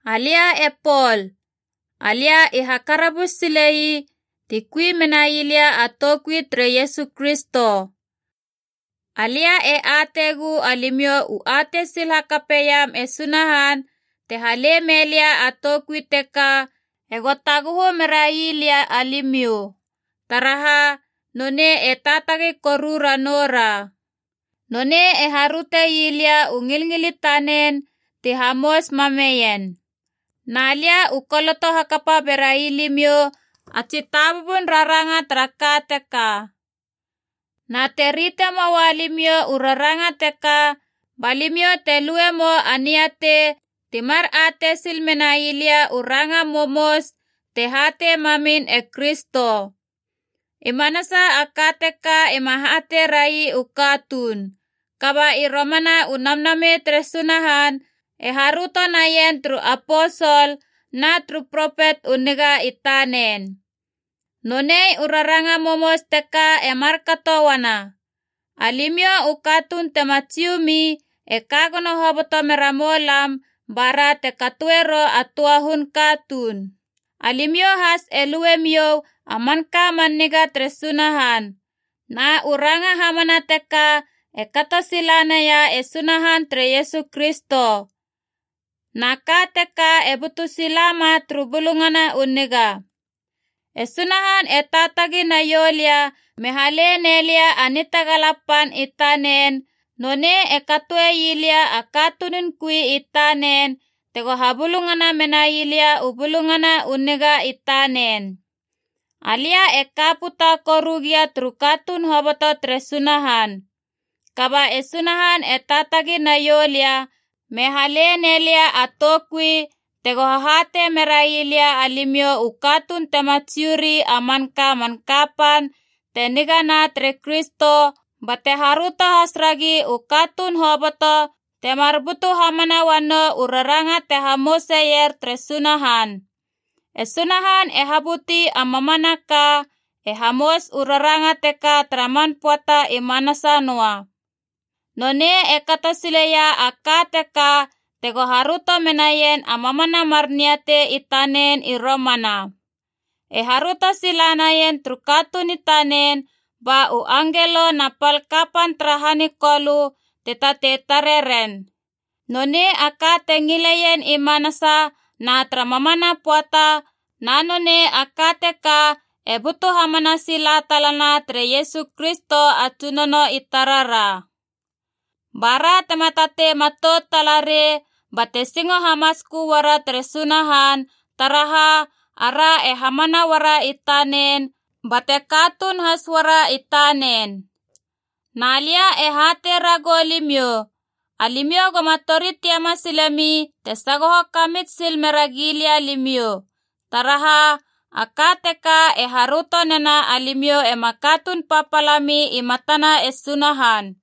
Alia e Pol, alia i hakarabus sile ii ti kui menai lia a toukui tere Iesu Kristo. Alia e ateigu alimiou u atei sil hakapeiam e Sunahan te hale mei lia a toukui teka ego taguhu merai lia alimiou, taraha nonei e taatagi koru ranoura. Nonei e haröte ii lia u ngilngil i tanen ti hamous mameien. Na lia u koloto hakapa berai limiou a tsi tabubun raranga tara ka teka. Na te rite moa limiou u raranga teka ba limiou te luemou a niatei ti mar atei sil menai lia u ranga momous te hatei mamin e Kristo. I manasa a ka teka ima hatei rai u katuun, kaba i romana u Namnamei tere Sunahan e haröto naien turu aposol na turu propet u niga i tanen. Nonei u raranga momous teka e markato uana: alimiou u katuun tema Jiu mi e ka gono hoboto mera moulam bara te katoeiera a töa hun katuun. Alimiou has e lue miou a manka man niga tere Sunahan. Na u ranga hamana teka e kato sila naia e Sunahan tere Iesu Kristo. Na ka teka e butu sila ma turu Bulungana u Niga. E Sunahan e taatagi naiou lia me hale ne lia a nitagala pan i tanen, nonei e katoe ii lia a katunun kui i tanen tego habulungana menai lia u Bulungana u Niga i tanen. Alia e ka puta koru gia turu katuun hoboto tere Sunahan. Kaba e Sunahan e taatagi naiou lia me hale ne lia a toukui tego hahatei merai lia alimiou u katuun tema Jiu ri a manka a man kapan te nigana tere Kristo, bate haröto has ragi u katuun hoboto temar butu hamana uanou u raranga te hamouseier tere Sunahan. E Sunahan te habuti a mamanaka, e hamous u raranga teka tara man pöata i manasa noa. Nonei e kato sile ii a ka teka tego haröto menaien a mamana mar niatei i tanen i romana. E haröto sila naien turu katuun i tanen ba u angelo na pal kapan tara han i Kolö te tatei tare ren. Nonei a ka te ngileien i manasa na tara mamana pöata, na nonei a ka teka e butu hamana sila talana tere Iesu Kristo a Tsunono i tarara. Ba ra tema tatei matout tala rei, bate singo hamatskö uara tere Sunahan, taraha ara e hamana uara i tanen bate katuun has uara i tanen. Na lia e hatei ragou limiou, alimiou goma tori tiama silemi te sagoho kamits sil mera gilia limiou. Taraha, a ka teka e haröto nena alimiou ema katuun papala mi i matana e Sunahan.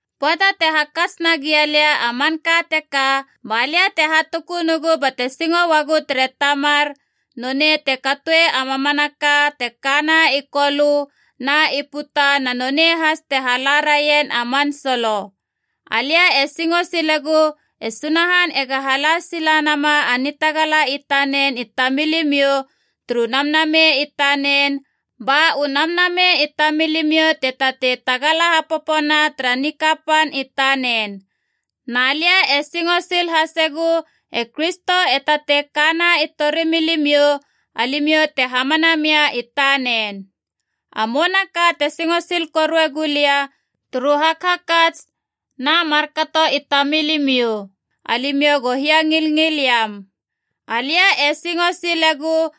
Pöata te hakats nagia lia a manka teka, ba lia te hatukunugu bate singo uagu tere Tamar, nonei te katoe a mamanaka te kana i Kolö na i puta na nonei has te hala raien a man solo. Alia e singo silegu e Sunahan ega hala sila nama a nitagala i tanen i tamilimiou turu Namnamei i tanen, ba u namnamei i tamilimiou te tatei tagala hapopona tara nikapan i tanen. Na lia e singo sil hasegu e Kristo e tatei kana i torimilimiou, alimiou te hamana mia i tanen. A mouna ka te singo sil korue gulia, turu hakhakats na markato i tamilimiou: alimiou go hiangilngil iam. Alia e singo silegu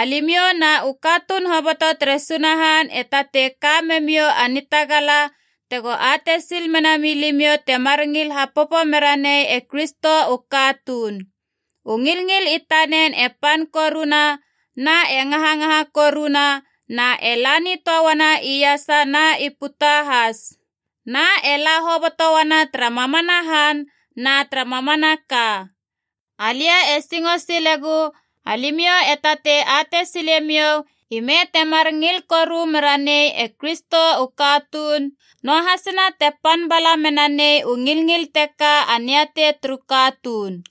alimiou na u katuun hoboto tere Sunahan e tatei ka memiou a nitagala tego atei sil mena milimiou temar ngil hapopo mera nei e Kristo u katuun. U ngilngil i tanen e pan koruna, na e ngahangaha koruna na e la nitöa uana iasa na i puta has. Na e la hoboto uana tara mamana han na tara mamanaka. Alia e singo silegu alimiou e tatei atei silemiou ime temar ngil koru mera nei e Kristo u katuun, noahasina te pan bala mena nei u ngilngil teka a niatei turu katuun.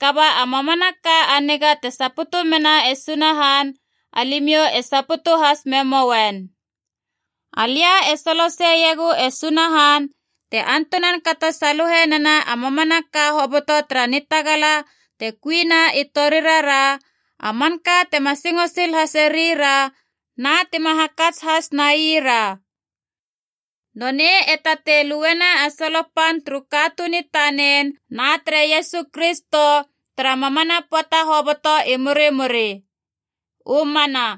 Kaba a mamanaka a niga te saputu mena e Sunahan alimiou e saputu has memouen. Alia e soloseiegu e Sunahan, te antunan kato saluhe nena a mamanaka hoboto tara nitagala te kuina i torirara, a manka tima singo sil hasei ra na tima hakats has nai ra. Nonei e tatei luena a solo pan turu katuun i tanen na tere Iesu Kristo tara mamana pöata hoboto i murimuri. U mana.